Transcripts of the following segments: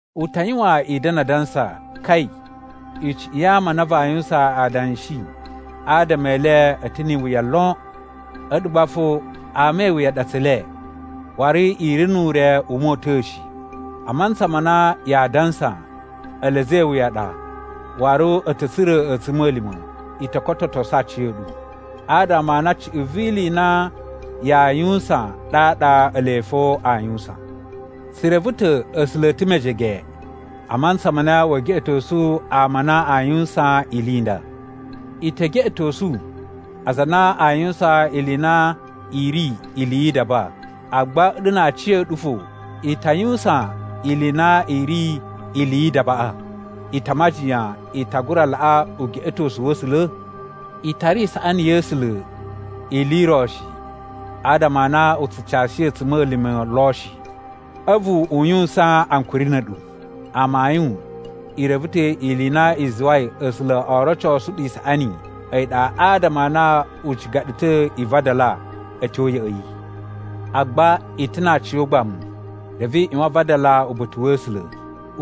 U ta yuwan i da̱na̱ adansa, “Kai! Icuꞌun ya ama a na vaa yuwusan adanshi adama e le a̱ ta̱ ni iwuya lon!” A̱ɗu gba fo ama a wuya a ɗa tse le, waru i ri nu ure u mota̱a̱ shi! A mantsa ma na yaa dansa ele a̱za̱ e iwuya a ɗa waru a̱ ta̱ tsura̱ a̱tsuma̱lima̱, i to kototosu aciya̱ɗu, adama a na cuꞌun vi ili i na yaa yuwusan ɗaɗa ele fo aa yuwusan. Tsu reve ta̱ A̱sula̱ a̱ ta̱ mejege a mantsa ma na wee geꞌetosu ama a na aa yuwusan ili i nda. I te geꞌetosu aza a na aa yuwusan ili i na i ri ili yi idaba, agba a̱ɗu na aciya̱ɗu fo i ta yuwusan ili i na i ri ili yi idabaꞌa. I ta majiyan i ta gura laꞌa ugeꞌetosu wa̱ A̱sula̱? I tara isaꞌani ya̱ A̱sula̱ ili i ro shi adama a na u tsu cashi a̱tsuma̱lima̱ lo shi, a̱vu u yuwusan ankuri na̱ a̱ɗu. Amayun i reve ta̱ ili i na i zuwai A̱sula̱ oo rocosu ɗu isaꞌani a̱yi ɗa adama a na u ciga ɗu ta̱ i vadala a̱ tyo ya̱ꞌa̱ yi. Agba i ta̱ na aciyogbamu reve i ꞌyuwan a vadala uba̱ta̱ wa̱ A̱sula̱.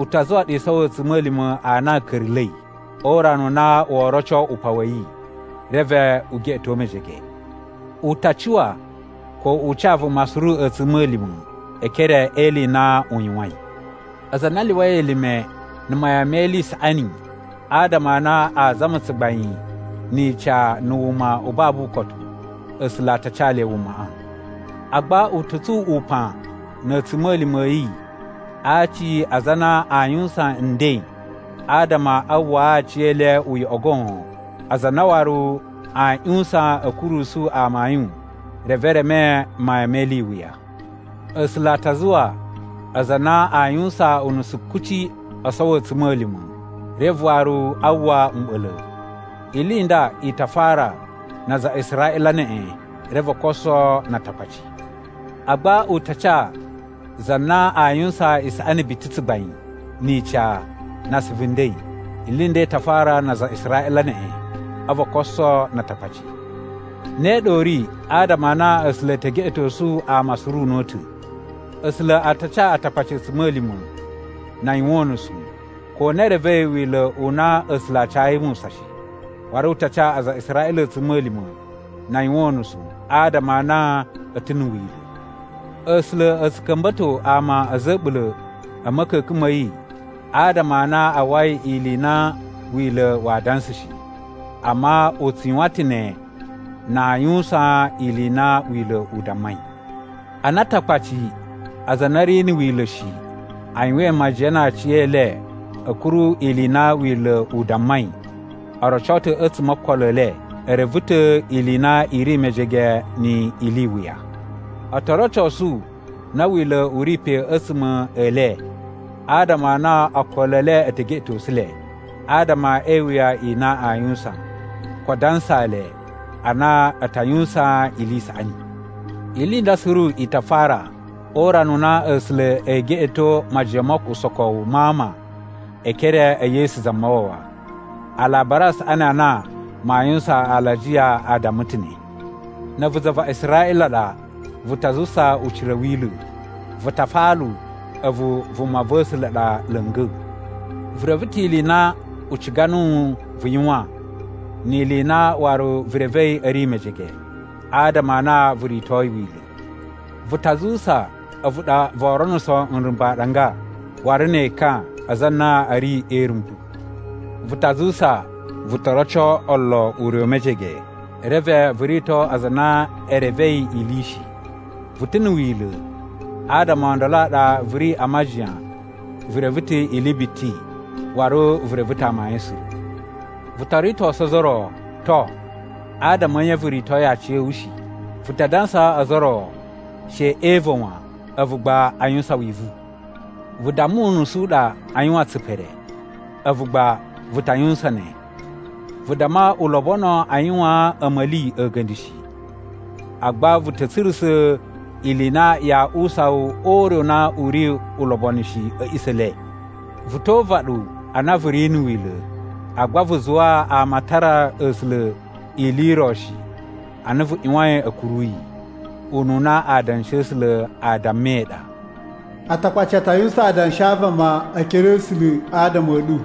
U ta zuwa ɗu i sowo a̱tsuma̱lima̱ a na a̱ ka̱ra̱la̱i, o urana u na woo roco upan wa̱ yi, reve u geꞌeto mejege. U ta cuwa ko u ca vuma suru a̱tsuma̱lima̱ e ekere e ili i na u yuwain. Aza a na a lyuwai elime na̱ mayan me ili i saꞌani adama a na a zama tsugbain ni ica na̱ wuma u babu ukotu, A̱sula̱ a ta ca le wumaꞌa. Agba u ta̱ tsun upan na̱ a̱tsuma̱lima̱ a̱ yi a aci a aza a na aa yuwusan nden adama a uwwaa aciyele uyoꞌo goon, aza a na waru a ꞌyuwusan a̱ kurusu amayun reve e reme mayan me ili i wuya. A̱sula̱ a ta zuwa aza a na aa yuwusan unusu kuci oo sowo a̱tsuma̱lima̱, reve waru a uwwa mɓa̱la̱. Ili i nda i ta fara na aza a Israꞌila neꞌen, reve o koso na Atakpaci. Agba u ta ca za na aa yuwusan isaꞌani biti, tsugbain, ni ica, na asuvu nden. Ili i nda i ta fara na aza a Israꞌila neꞌen, a̱vu o koso na Atakpaci. Ne ɗa u ri adama a na A̱sula̱ e te geꞌetosu ama suru una̱ta̱. A̱sula̱ a ta ca Atakpaci a̱tsuma̱lima̱ na a yuwan unusu, ko na e revei Wila̱ u na A̱sula̱ a cayi Musa shi. Waru u ta ca aza a Israꞌila a̱tsuma̱lima̱ na a yuwan unusu, adama a na a̱ ta̱ na̱ Wila̱. A̱sula̱ a̱ tsu ka̱mba̱to ama a̱za̱ a̱ a̱ɓula̱ a̱ ma̱ka̱ka̱n ma̱ yi adama a na a uwwai ili i na Wila̱ waa dansa shi. Amma u tsu yuwan ta̱ ne na aa yuwusan ili i na Wila̱ u dammai. Ana Atakpaci, aza a na a̱ ri na̱ Wila̱ shi, a yuwain majiyan na aciyele a̱ kuru ili i na Wila̱ u dammai, o roco ta̱ a̱tsuma̱ o okolo e le e reve ta̱ ili i na i ri mejege ni ili i wuya. O to rocosu na Wila̱ u ri pe a̱tsuma̱ e le, adama a na okolo e le e te geꞌetosu le, adama e iwuya i na aa yuwusan, ko adansa le a na a ta yuwusan ili i saꞌani. Ili i nda suru i ta fara o urana u na A̱sula̱ ee geꞌeto majiyan mo usokowu ma ama e ekere e Yesu Zamawawa. Alabari a Saꞌani a na maa yuwusan alajiya a damma ta̱ ne. Na̱ a̱vu za va Israꞌila ɗa, vu ta zuwusa ucira a̱ Wila̱. Vu ta afalu a̱vu vuma va̱ A̱sula̱ ɗa la̱nga̱. Vu reve ta̱ ili i na u ciga nuwu vu yuwan ni ili i na waru vu revei a̱ ri mejege, adama a na vu ritoi Wila̱. Vu ta zuwusa a̱vu ɗa voo ronuso nrumba̱ aɗanga waru ne ekan a aza a na a̱ ri e irumbu. Vu ta zuwusa vu to roco olo ure u mejege, reve vu rito aza a na e revei ili shi. Vu ta̱ na̱ Wila̱, adama o ndolo a ɗa vu ri a majiyan vu reve ta̱ ili biti waru vu reve ta̱ amayun suru. Vu to ritosu ozo o ro, to, adama a̱ nye vu ritoi aciya̱wu shi? Vu ta dansaa ozo o ro she e iva̱ wan, a̱vu gba a yuwusan wivu. Vu damma unusu u ɗa a yuwan tsipere, a̱vu gba vu ta yuwusan ne. Vu damma u lobono a yuwaan a̱ma̱li a̱ga̱nda̱ shi, agba vu ta̱ tsurusa̱ ili i na yaa uwusa wu ure u na u ri ulobonu shi a̱ a̱ꞌisa̱ e le. Vu to uvaɗu a na vu ri na̱ Wila̱, agba vu zuwa ama a tara A̱sula̱ ili i ro shi ana vu ꞌyuwain a̱ kuru yi. Ununa Adanshi a̱ A̱sula̱ a dammai ɗa, “Atakpaci a ta yuwusan adanshi a vama e ekere a̱ A̱sula̱ adama a̱ ɗu.”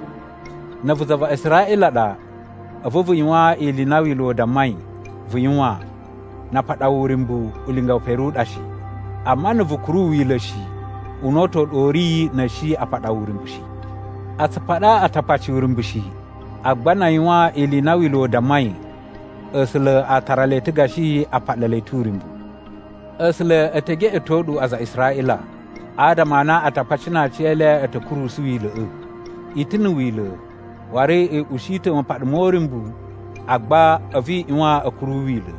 Na̱ a̱vu za va Israꞌila ɗa, a̱vu vu yuwan ili i na Wila̱ u dammai vu yuwan, na a paɗa wu uryumbu, ulinga we pere u ɗa shi. Amma na̱ vu kuru Wila̱ shi, una̱ta̱ u ɗa u ri na̱ a̱ shi a paɗa wu uryumbu shi. A tsu paɗa Atakpaci uryumbu shi, agba na a yuwan ili i na Wila̱ u dammai, A̱sula̱ a tara le ta̱ gashi a paɗa le ta̱ uryumbu. A̱sula̱ e te geꞌeto ɗu aza a Israꞌila, adama a na Atakpaci na aciyele a̱ ta̱ kurusu Wila̱ꞌa̱. I ta̱ na̱ Wila̱, waru i ushi ta̱ mapaɗa mo uryumbu, agba a̱vu i ꞌyuwan a̱ kuru Wila̱.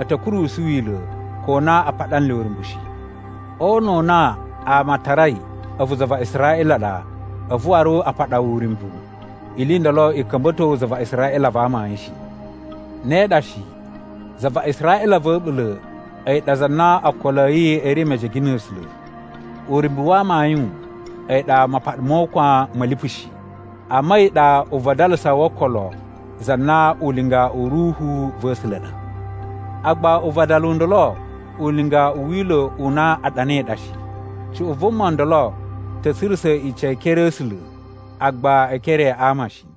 A̱ ta̱ kurusu Wila̱ ko na a paɗa nle uryumbu shi. O una̱ u na ama a tarai a̱vu za va Israꞌila ɗa, a̱vu waru a paɗa wu uryumbu, ili i ndolo i ka̱mba̱to wu za va Israꞌila va amayun shi. Ne ɗa shi, za va Israꞌila va̱ a̱ɓula̱ a̱yi ɗa za na okolo a̱ yi a̱ ri mejege na̱ A̱sula̱. Uryumbu wa amayun a̱yi ɗa mapaɗa mo ukwan ma̱ lipu shi, amma a̱yi ɗa uvadalasa wo okolo za na ulinga u Ruhu va̱ A̱sula̱ ɗa. Agba uvadalu u ndolo ulinga u Wila̱ u na a ɗanai ɗa shi. Cuꞌun vuma ndolo ta̱ tsurusa̱ ica e ekere a̱ A̱sula̱, agba e ekere a ama shi.